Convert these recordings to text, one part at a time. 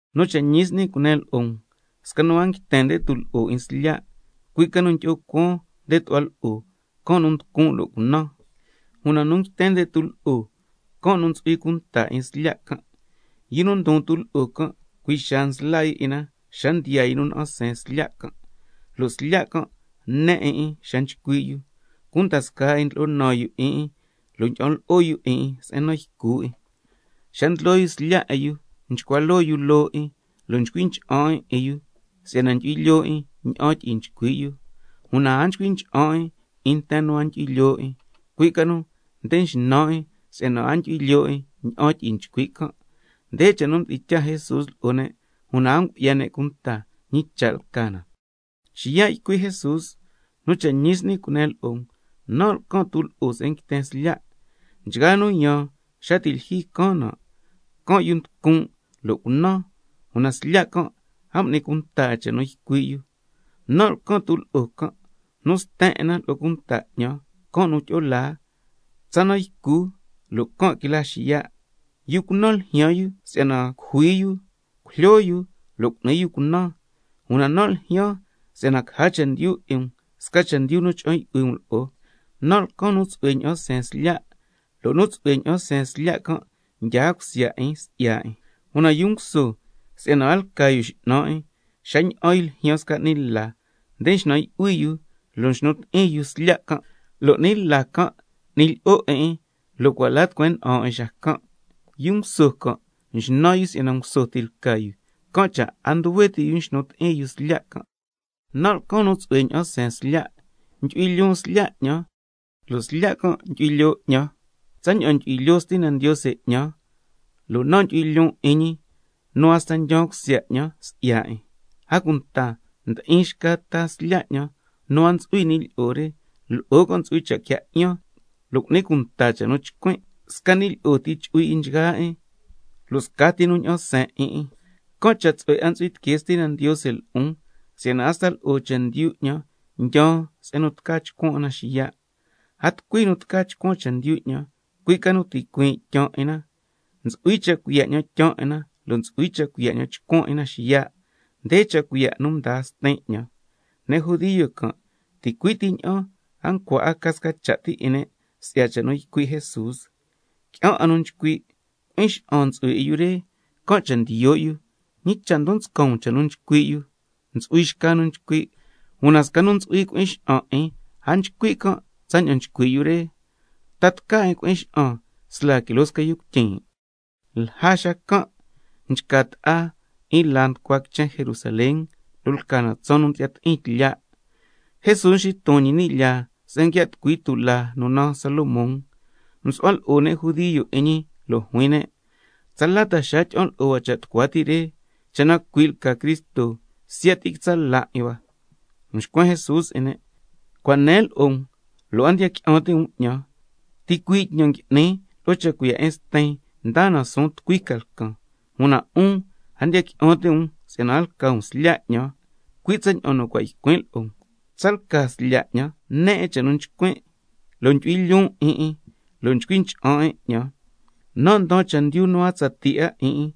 Nu cha' ñi s'ni cunen lo'o um, sca nu a nguiten nde tulo'o 'in slya', cui' ca nu ndyi'o cuaan nde tu'hua lo'o, can' nu nducun' lo' cunan. Una nu nguiten nde tulo'o, can' nu ntsu'hui cunta 'in slya' can'. Yu nu ndon tulo'o can', cui' xaa nsla yu 'in na xa ndiyaa yu nu na'an seen slya' can', lo' slya' can' ne 'in 'in xa nchcui' yu, cunda scaa 'in ndlo'o naan yu 'in 'in, lo' ndyi'an lo'o yu 'in 'in se'en nan ycu 'in. Xa ndlyoo yu slya' 'in yu nchcua loo yu loo 'in, lo' nchcui ncha'an 'in 'in yu si'yana ndyu'hui lyoo 'in ña'an tyi'i nchcui' yu. Una a nchcui ncha'an 'in 'in nten nu a ndyu'hui lyoo 'in, cui' ca nu nde nxnan 'in si'yana a ndyu'hui lyoo 'in ña'an tyi'i nchcui' can'. Nde cha' nu mdi'in tyaa Jesús lo'o ne', una a ngu'ya ne' cunta ñi cha' lca na. Xiya' mxitucui Jesús ycui' ñi: Nu cha' ñi s'ni cunen lo'o um, nan' lcan tulo'o se'en nguiten slya'. Nchgaa nu yaan xa ti' lyijyi caan nan', lca can' yu nducun' lo' cunan, una slya' can' a m'ni cunta 'in cha' nu ycui' can'. Nan' lcan tulo'o can', nu sten 'in na lo'o cunta 'ñan, can' nu tyi'o laa, tsa nan ycu, lo' ticui' can' quila xiya'. Yu cunan ljyaan yu si'yana cujui yu, si'yana cujlyo yu lo' cu'ni yu cunan. Una nan' ljyaan si'yana caja chendyu 'in um, sca chendyu nu cha'an yu'hui um lo'o. Nan' lcan sca nu tsu'hue ña'an seen slya', lo' nu tsu'hue ña'an seen slya' can' ndyaa cusya 'in si'ya 'in. Una yu nguso si'yana a lca yu x'nan 'in, xa ña'an yu ljyaan sca 'ni la, nde nxnan yu'hui yu lo' nxnu ti'in yu slya' can', lo' 'ni la can' n'ni lyi'o 'in 'in, lo' cua' la tucueen nda'an 'in xacan'. Yu nguso can' nxnan yu si'yana nguso ti lca yu, can' cha' a nduhue ti' yu nxnu ti'in yu slya' can'. Nan' lcan nu tsu'hue ña'an seen slya', ndyu'hui lyoon slya' 'ñan, lo' slya' can' ndyu'hui lyoo 'ñan, tsaña'an ndyu'hui lyoo Stina Ndiose 'ñan, lo' nan' ndyu'hui lyoon 'in ñi, nu hasta ndyaan cusya 'ñan si'ya 'in. A cunta ndi'in xca ta slya' 'ñan nu a ntsu'hui ni' lyi'o re, lo'o can' ntsu'hui cha' quia 'yan, lo' cu'ni cunta cha' nu chcuin'. Sca ni' lyi'o ti chu'hui 'in nchgaa 'in, lo' scati nu ña'an seen 'in 'in. Can' cha' tsu'hue 'a ntsu'hui tiquee Stina Ndiose lo'on, si'yana hasta lo'o chendyu 'ñan ndyaan se'en nu tca chcuan 'in na xiya'. A tucui nu tca chcuan chendyu 'ñan, cui' ca nu ticuiin' ndyaan 'in na. Ntsu'hui cha' cuiya' 'ñan tyaan 'in na, lo' ntsu'hui cha' cuiya' 'ñan chcuan 'in na xiya'. Nde cha' cuiya' nu mdaa Stin 'ñan. Ne' judio can', ticui' ti ña'an a ncua 'a ca sca cha' ti 'in ne' si'ya cha' nu ycui' Jesús. Qui'an nu nchcui': Cui'in xa'an ntsu'hui 'in yu re, can' cha' ndiyo' yu. ¿Ñi cha' ndon nscan um cha' nu nchcui' yu? Ntsu'hui xca nu nchcui': Una sca nu ntsu'hui cui'in xa'an 'in a nchcui' can' tsaña'an nchcui' yu re. ¿Ta tca 'in cui'in xa'an sla quiloo sca yu cuityin'? Lja xacan' nchca ta'a 'in laa nu nducua quichen Jerusalén, lo' lca na tsaan nu ndyi'ya ti'in tlya'. Jesús nxiton ñi ni' lyaa se'en nguia' tucui tulaa nu naan Salomón. Msu'hua lo'o ne' judio 'in ñi lo' juin ne': ¿Tsala ta xaa tyi'an lo'o hua cha' tucua ti' re? Cha' na cui' lca Cristo, siya' ti quitsa' la 'in hua. Mxcuen Jesús 'in ne': Cua' nen lo'o um, lo' a ndiya qui'an ti' um 'ñan. Una ticuii' tñan nu ngui'nin lo'o cha' cuiya' 'in Stin, ndaa na suun tucui ca lcan. Una 'un a ndiya qui'an ti' um si'yana a lca um slya' 'ñan, cui' tsaña'an nu cua' ycuin' lo'o um. Una tsalca slya' 'ñan ne 'in cha' nu nchcuin', lo' ndyu'hui lyoon 'in 'in, lo' nchcui ncha'an 'in 'ñan. Nan' ndaan chendyu nu a tsatii 'a 'in 'in,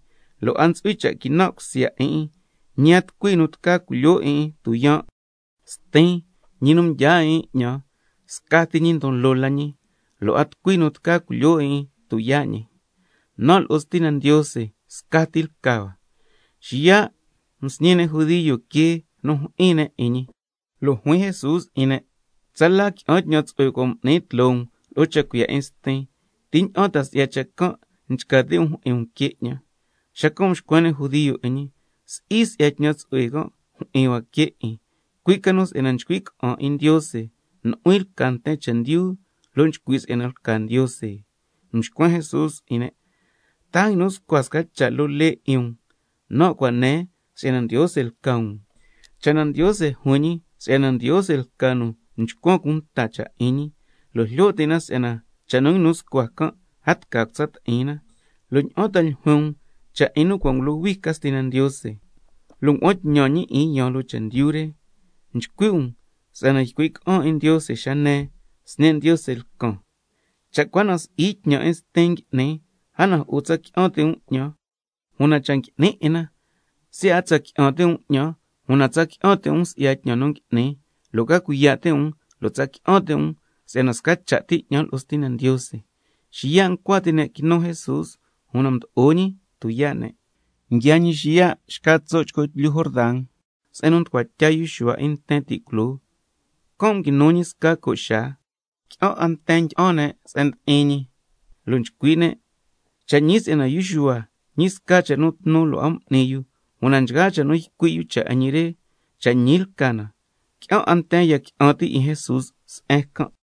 lo' a ntsu'hui cha' quinan' cusya 'in 'in, ñi a tucui nu tca culyoo 'in 'in tuyaan'. Stin, ñi nu mdyaa 'in 'in 'ñan, scati ñi ndon loo la ñi, lo' a tucui nu tca culyoo 'in 'in tuyaa' ñi. Nan' lo'o Stina Ndiose, scati lca hua. Xiya' msñi ne' judio quee nu jyi'in ne' 'in ñi. Lo' juin Jesús 'in ne': Tsala qui'an tñan tsu'hue cua' m'nin tloo um lo'o cha' cuiya' 'in Stin. ¿Ti ña'an ta si'ya cha' can' nchca ti' um jyi'in um quee 'ñan? Xacan' mxcuen ne' judio 'in ñi: Si'i si'ya tñan tsu'hue can' jyi'in hua quee 'in, cui' ca nu si'yana nchcui' ca'an 'in Ndiose, nu'huin lca nten chendyu lo' nchcui' si'yana lca Ndiose. Mxcuen Jesús 'in ne': ¿Ta a nguinu scua sca cha' loo lee 'in um: —Nan' cua' nen si'yana ndiose lca um—? Cha' na Ndiose juin ñi si'yana ndiose lca nu mchcuan cunta cha' 'in ñi, (lo' jlyo ti' na si'yana cha' nu nguinu scua can' a tca cutsa ti'in na), ¿lo' ña'an ta ljuin um cha' 'in nu cua' ngulohui ca Stina Ndiose, lo' ngua'an tñan ñi 'in yaan loo chendyu re? Nchcui' um si'yana ycuin' ca'an 'in Ndiose xa nen: Sñe' Ndiose lcan. Cha' cua na si'i tñan 'in Stin ngui'nin, a na jo'o tsa qui'an ti' um 'ñan. Una cha' ngui'nin 'in na, siya' a tsa qui'an ti' um 'ñan, una tsa qui'an ti' um si'ya tñan nu ngui'nin, lo' ca cuiya' ti' um lo' tsa qui'an ti' um si'yana sca cha' ti 'ñan lo'o Stina Ndiose. Xiya' ncua ti' ne' quinu Jesús, una mdo'o ñi tuyaa' ne'. Xacan' xiya' nguiaa ñi xca tso' chco tlyu Jordan, se'en nu mducua tya yu Xuhua 'in nten ti' culoo. Can' nguinu ñi sca co' xaa. Qui'an 'a nten ndyi'an ne' se'en ndi'in ñi, lo' nchcui' ne': Cha' ñi si'yana yu Xuhua ñi sca cha' nu tnu lo' a m'ni yu, una nchgaa cha' nu ycui' yu cha' 'in ñi re, cha' ñi lca na. Qui'an 'a nten ya qui'an ti' 'in Jesús se'en can'.